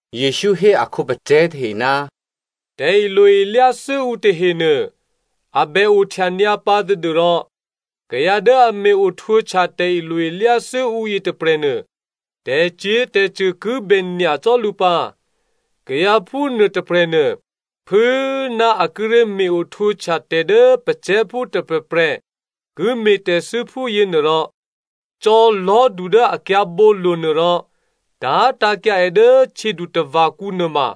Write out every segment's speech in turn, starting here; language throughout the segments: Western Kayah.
Jesǔ hé a khǒpacè̤̌ tahe, “Tè̤ilo-ilyáthû́ ǔ tahenuô a bè ohtya nyǎ pǎ tadû́rò kayǎ dố a me̤-o htwǒhtya tè̤ilo-ilyá thû́ ǔ yětôprè̤nuô, tè̤cyě̤tè̤cṳ̂ ki bè nyacò́ lǔ pǎ. Kayǎ phúnuô tôprè̤nuô phû꤮ ná a kíré̤ me̤-ohtwǒhtya tè̤ dố kayǎ patílố dố ǔklè̌ tôprè̤prè̤ ki me̤tè̤thû́ phúyě nuôrò, cò̌ lò̤́du dố a kyǎ̤bǒlo̤nuô rò tá̤tǎ̤kyǎ è dố htyědutava̤kǔ nuôma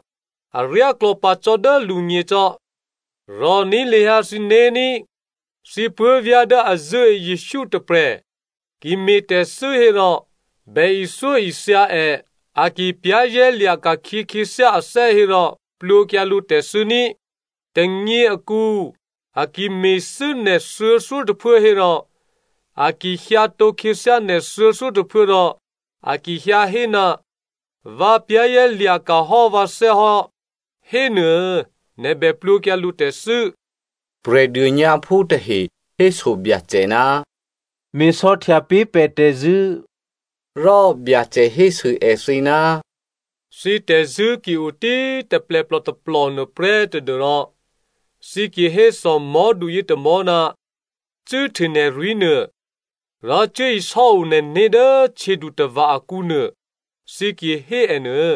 aryáklò̌ pǎ cò́ dố lǔgně cò́. Rò̤ní̤ lahyǎ thǐné̤ ní꤮. “Thǐ puố̤vyá̤ dố a zṳ̂́e Jesǔ tôprè̤ ki me̤tè̤thû́ hérò, bè ithyóithya è. A ki za̤ ní̤ hò́ ané̤ hérò plwǒkyǎ lǔ tè̤thû́ ní꤮. Tônyě akǔ, a ki me̤thû́ nè̤ thuô̌thyótôphuố hérò, a ki hyǎtǒ khyěthyá nè̤ thuô̌thyótôphuố rò a ki hyǎ hé, ‘Vǎ za̤ ní̤dû hò́ vǎné̤’ hénuô, nè̤ bè plwǒkyǎ lǔ tè̤thû́.” Prè̤dônyǎphú tahe héso Byacè, “Me̤sò̌htya pé̤ pè̤ tè̤zṳ̂́.” Rò Byacè hésû èthǐ, “Thǐ tè̤zṳ̂́ ki o tí꤮ taplèplò tôplò nuôprè́ tadû́rò thǐ ki hé thòmò̤́du yětômò̤́, ‘Cû́hte nè̤rwí̤nuô, rò cuốisò́o nè̤né̤ dố htyědutava̤ akǔnuô,’ thǐ ki hé è nuô,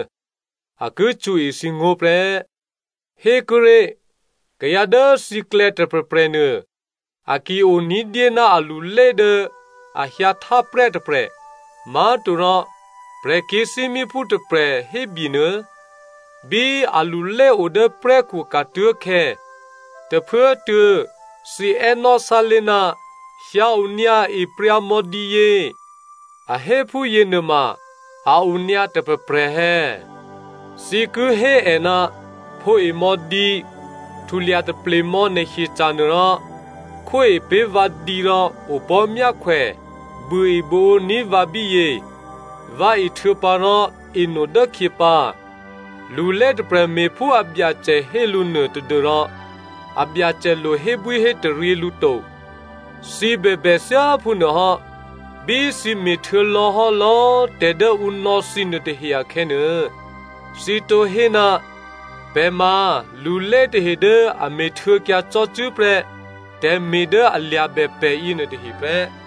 a ki cṳ̌e thǐngó̤ prè́. “Hékuốré̤, kayǎ dố thǐklè̌ tôprè̤prè̤nuô, a ki o ní̤dyé ná alulé dố a hyǎhtá prè́ tôprè̤, má̤torò prè̤kyě̤thímíphú tôprè̤ hébyenuô. Bí alulé o dố prè́khu ka̤tuố̤khè̌, tôphuốtuô̌ thǐ è́nò́ sálé̤, ‘Hyǎ onyǎ epryǎ mò̌ dǐyě,’ a hé phúyě nuôma a o nyǎ tôprè̤prè̤ è̌? Thǐ ki hé è, ‘Phǒe mò̌ dǐ, htulya taple mò̌ nè̤ hyeca̤nuô rò khwóe pé̤ vǎ dǐ rò opò̤́myákhwè buôebuôǒní̤ vǎ bíyě, vǎ ehtuô̌pǎ rò eno dốkhyě pǎ.’ Lulé tôprè̤ me̤phú abyacè hé lǔ nuô tadû́rò abyacè lo hébwíhétaryě lǔ to. Thǐ bèbè thyáphúnuô hò́. Bí thǐ me̤htuô̌lò̌hò́ lò̌꤮ tè̤ dố ǔ nò̌ thǐ nuôtahe akhè̌nuô, thǐ tǒ hé, ‘Pè̤ ma lulé tahe dố a me̤htuô̌kyǎ cò́cû́ prè́ tè̤me̤ dố a lya̤bè pè̤ yěnuôtahe prè́.’”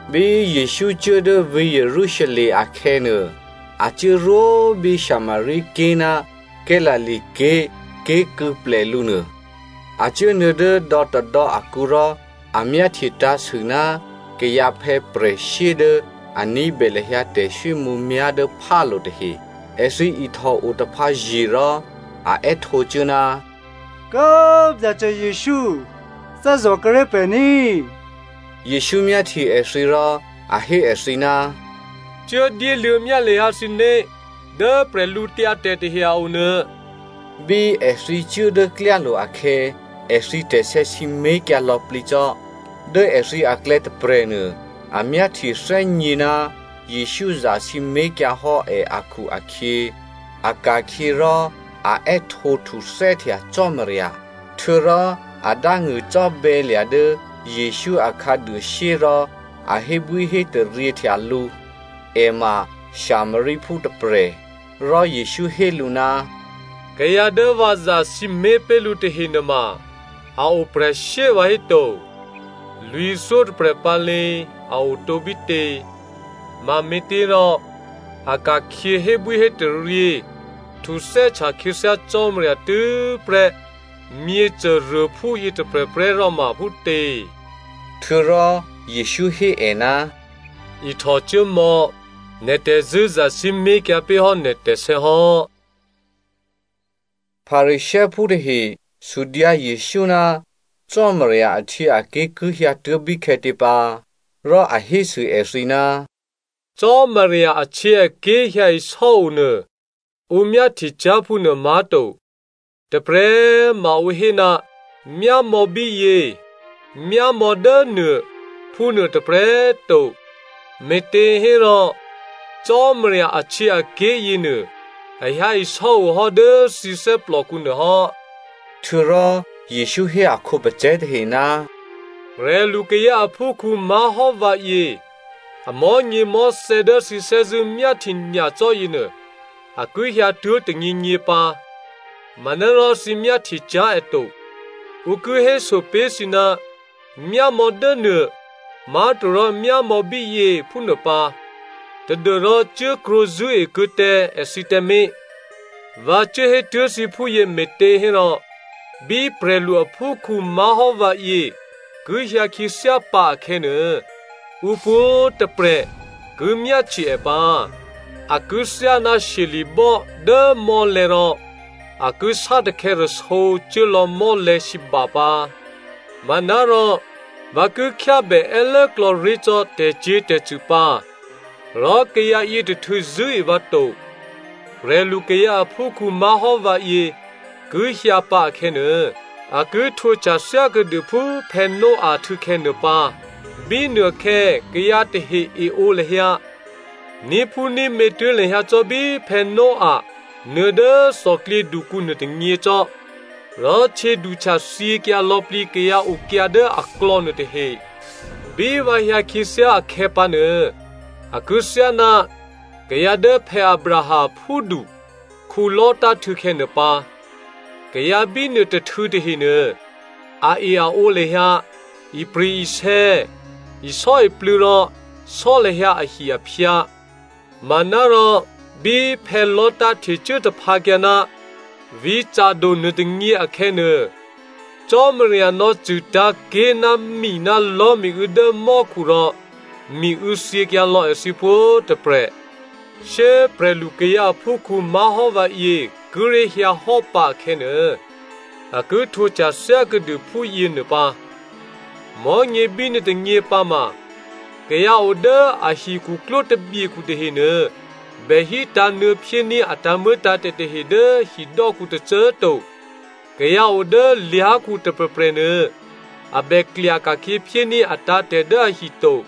Bí Jesǔ cuố dố vǐ̤ Jerusalem akhè̌nuô, a cuốrwó bí Samaria ké̤ ná Galilea ké̤ ké̤kû̌plè lǔ nuô. A cuốnuô̌ dố dò̌tôdò̌ akǔ rò a myáhtye tǎ̤sû ná kayǎphè̌ prè̤shyé dố a ní̤bè lahyǎ tè̤swímǔmyá̤ dố phálo̤ tahe. Èthǐ ihtòo taphǎye̤ rò, a è́htǒcuố, “Kố꤮ Byacè Jesǔ! Thè́zò̤ kuô̌ré̤ pè̤ ní꤮!” Jesǔ myáhtye èthǐ rò a hé èthǐ, “Cuố dyéluô̌ myá lahyǎ thǐné̤ dố bwídu tahe a o nuô.” Bí èthǐ cuố dố klyálo̤ akhè̌, èthǐ tè̤sè̌ sǐmé̤kyǎ lò̌plǐ cò́. Dố èthǐ aklè̌ tôprè̤nuô, a myáhtyethè́gně ná Jesǔ zasǐmé̤kyǎ hò́ è akhu-akhyě, a ka̤khyě rò a è́htǒhtuthè́htya Cò́marya. Htuô̌rò a dángṳ̂cò́bè̌lya̤ dố Jesǔ a khǎduôshyé rò a hébwíhétaryěhtya lǔ. È ma Samariaphú tôprè̤. Rò Jesǔ hé lǔ, “Kayǎ dố vǎ zasǐmé̤ pé̤ lǔ tahe nuôma a o prè̤shyé vǎhéto! Lwǐ̤thyótôprè̤ pǎ lě꤮ a otǒ bítě? Mame̤těrò a ka̤khyě hébwíhétaryě htuthè́htya khyěthyá Cò́marya tû́prè́ myěcôruôphú yětôprè̤prè́ ròma phútě?” Htuô̌rò Jesǔ hé è, “Ihtòcuốmò̌, nè̤ tè̤zṳ̂́ zasǐmé̤kyǎ pé̤ hò́ nè̤ tè̤sè̌ hò́.” Pharisěophú tahe sudyǎ Jesǔ ná Cò́marya ahtyěaké̤ ki hyǎtuố̤ bíkhè̌tě pǎ. Rò a hésû èthǐ, “Cò́marya ahtyěaké̤ hyǎisò́o nuô ǔ myáhtye cyá̤ phúnuô má̤to. Tôprè̤꤮ ma ǔ hé, ‘Myámò̌ bíyě,’ ‘Myámò̌ dốnuô,’ phúnuô tôprè̤꤮ to, me̤těhérò Cò́marya ahtyěaké̤ yěnuô a hyǎisò́o hò́ dố thǐ thè́plòkǔ nuôhò́.” Htuô̌rò Jesǔ hé a khǒpacè̤̌ tahe, “Prè̤lukayǎ aphúkhǔ má̤hò́ vǎyě amò̤́nyěmò̤́thè̌ dố thǐ thè́zṳ̂́ myáhtye nyacò́ yěnuô, a ki hyǎtuố̤ tônyěnyě pǎ, manárò thǐ myáhtye cyá̤ è to. Ǔ ki héso pé̤ thǐ, ‘Myámò̌ dố nuô’ má̤torò ‘Myámò̌ bíyě’ phúnuô pǎ! Tadû́rò cuốkrwǒ zṳ̂́e kuô̌ tǎ èthǐ tǎmé̤. Vǎ cuốhétuố̤ thǐ phúyě me̤těhérò, bí prè̤lu aphúkhǔ má̤hò́ vǎyě ki hyǎ khyěthyá pǎ akhè̌nuô, ǔ pwǒ̤꤮ tôprè̤ ki myáhtye è pǎ. A ki thyáná shyeli̤bò́ dố mò́lè̤̌ rò a ki sátakhè̌ rasǒ cuố lò̌ mò́lè̤̌sǐba pǎ. Manárò vǎ ki khyábè è́lốklò̌ ré̤ cò́ tè̤cyě̤tè̤cṳ̂ pǎ, rò kayǎ yětôhtû̌ zṳ̂́e vǎ to. “Prè̤lukayǎ aphúkhǔ má̤hò́ vǎyě ki hyǎpǎ akhè̌nuô, a ki htwǒhtya thyákuô̌dû phú Noah htû̌khè̌ nuô pǎ. Bínuôkhè̌ kayǎ tahe eǒ lahyǎ, ní̤phúní̤mě tuố̤ lahyǎ cò́ bí Noah nuô̌ dố thòklyědukǔ nuôtônyě cò́. Rò htyěduhtya thyěkyǎ lò̌plǐ kayǎ okyǎ dố aklò̌ nuôtahe. “Bí vǎ hyǎ khyěthyá akhè̌pǎnuô, a ki thyáná kayǎ dố Abraham aphúdu Lot htû̌khè̌ nuô pǎ. Kayǎ bínuô tôhtû̌ tahenuô, ae-aǒ lahyǎ, ipri̤-isè̌, isò́iplû̌ rò sò́ lahyǎ ahi-aphyǎ. Manárò bí Lot htecuố taphǎkyǎ ná vǐ̤ Sodom nuôtônyě akhè̌nuô, Cò́marya nò̌cṳ̂tǎ̤ ké̤ ná mi ná lò̤́miû̌ dố mò́khu rò miû̌ thyěkyǎ lò̌ èthǐ pwǒ̤꤮ tôprè̤. “Shyé꤮ prè̤lukayǎ aphúkhǔ má̤hò́ vǎyě kíré̤ hyǎhò́ pǎ akhè̌nuô, a ki htwǒhtya thyákuô̌dû phúyěnuô pǎ. Mò̤́nyě bínuô tônyě pǎ ma, kayǎ o dố a hikhuklwó tabyekhu tahenuô bè hítǎ̤ nuô̌ phyéní̤ a tǎ̤muô̌tǎ̤tè̤ tahe dố hidò́kǔ tôcô꤮ to! Kayǎ o dố lyá̤khu tôprè̤prè̤ nuô a bè klya ka̤khyě phyéní̤ atǎ̤tè̤ dố ahi to.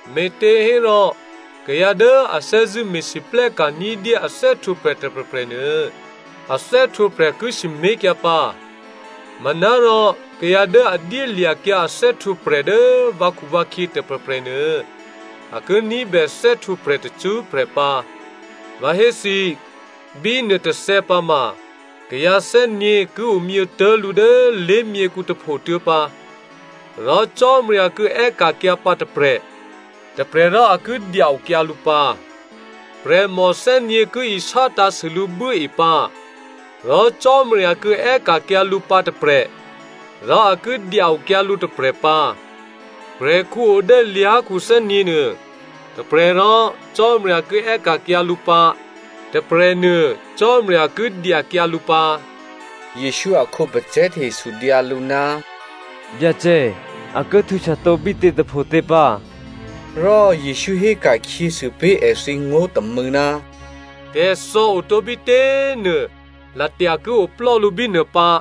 Me̤těhérò kayǎ dố a thè́zṳ̂́ me̤lwóhteka̤ ní̤dyé a thè́htwǒprè̤ tôprè̤prè̤nuô, a thè́htwǒprè̤ ki sǐmé̤kyǎ pǎ. Manárò kayǎ dố a dyélya̤kyǎ a thè́htwǒprè̤ dố vǎkhuvǎkhyě tôprè̤prè̤nuô, a ki ní̤bè thè́htwǒprè̤ tacṳ́prè̤ pǎ. Vǎ hé thǐ, bí nuôtôthè̌ pǎma, kayǎ thè́nyě̤ ki omyětố̤lǔ dố lé̤myěkhu tôphotuô̌ pǎ. Rò Cò́marya ki è́ka̤kyǎ pǎ tôprè̤, tôprè̤rò a ki dya-okyǎ lǔ pǎ. Prè̤mò thè́nyě̤ ki isátṳ̂̌sû lǔ buốe pǎ. Rò Cò́marya ki è́ka̤kyǎ lǔ pǎ tôprè̤, rò a ki dya-okyǎ lǔ tôprè̤ pǎ. Prè̤khǔ o dố lyá̤khu thè́nyě̤nuô, tôprè̤rò Cò́marya ki è́ka̤kyǎ lǔ pǎ, tôprè̤nuô Cò́marya ki dyakyǎ lǔ pǎ.” Jesǔ a khǒpacè̤̌ tahe sudyǎ lǔ, “Byacè, a ki htwǒhtya tǒ bítě tôphotě pǎ?” Rò Jesǔ héka̤khyěsû pé̤ èthǐ ngó̤ tômû̌, “Tè̤thò̌ otǒ bítě꤮ nuô, latya ki oplò́lǔ bínuô pǎ.”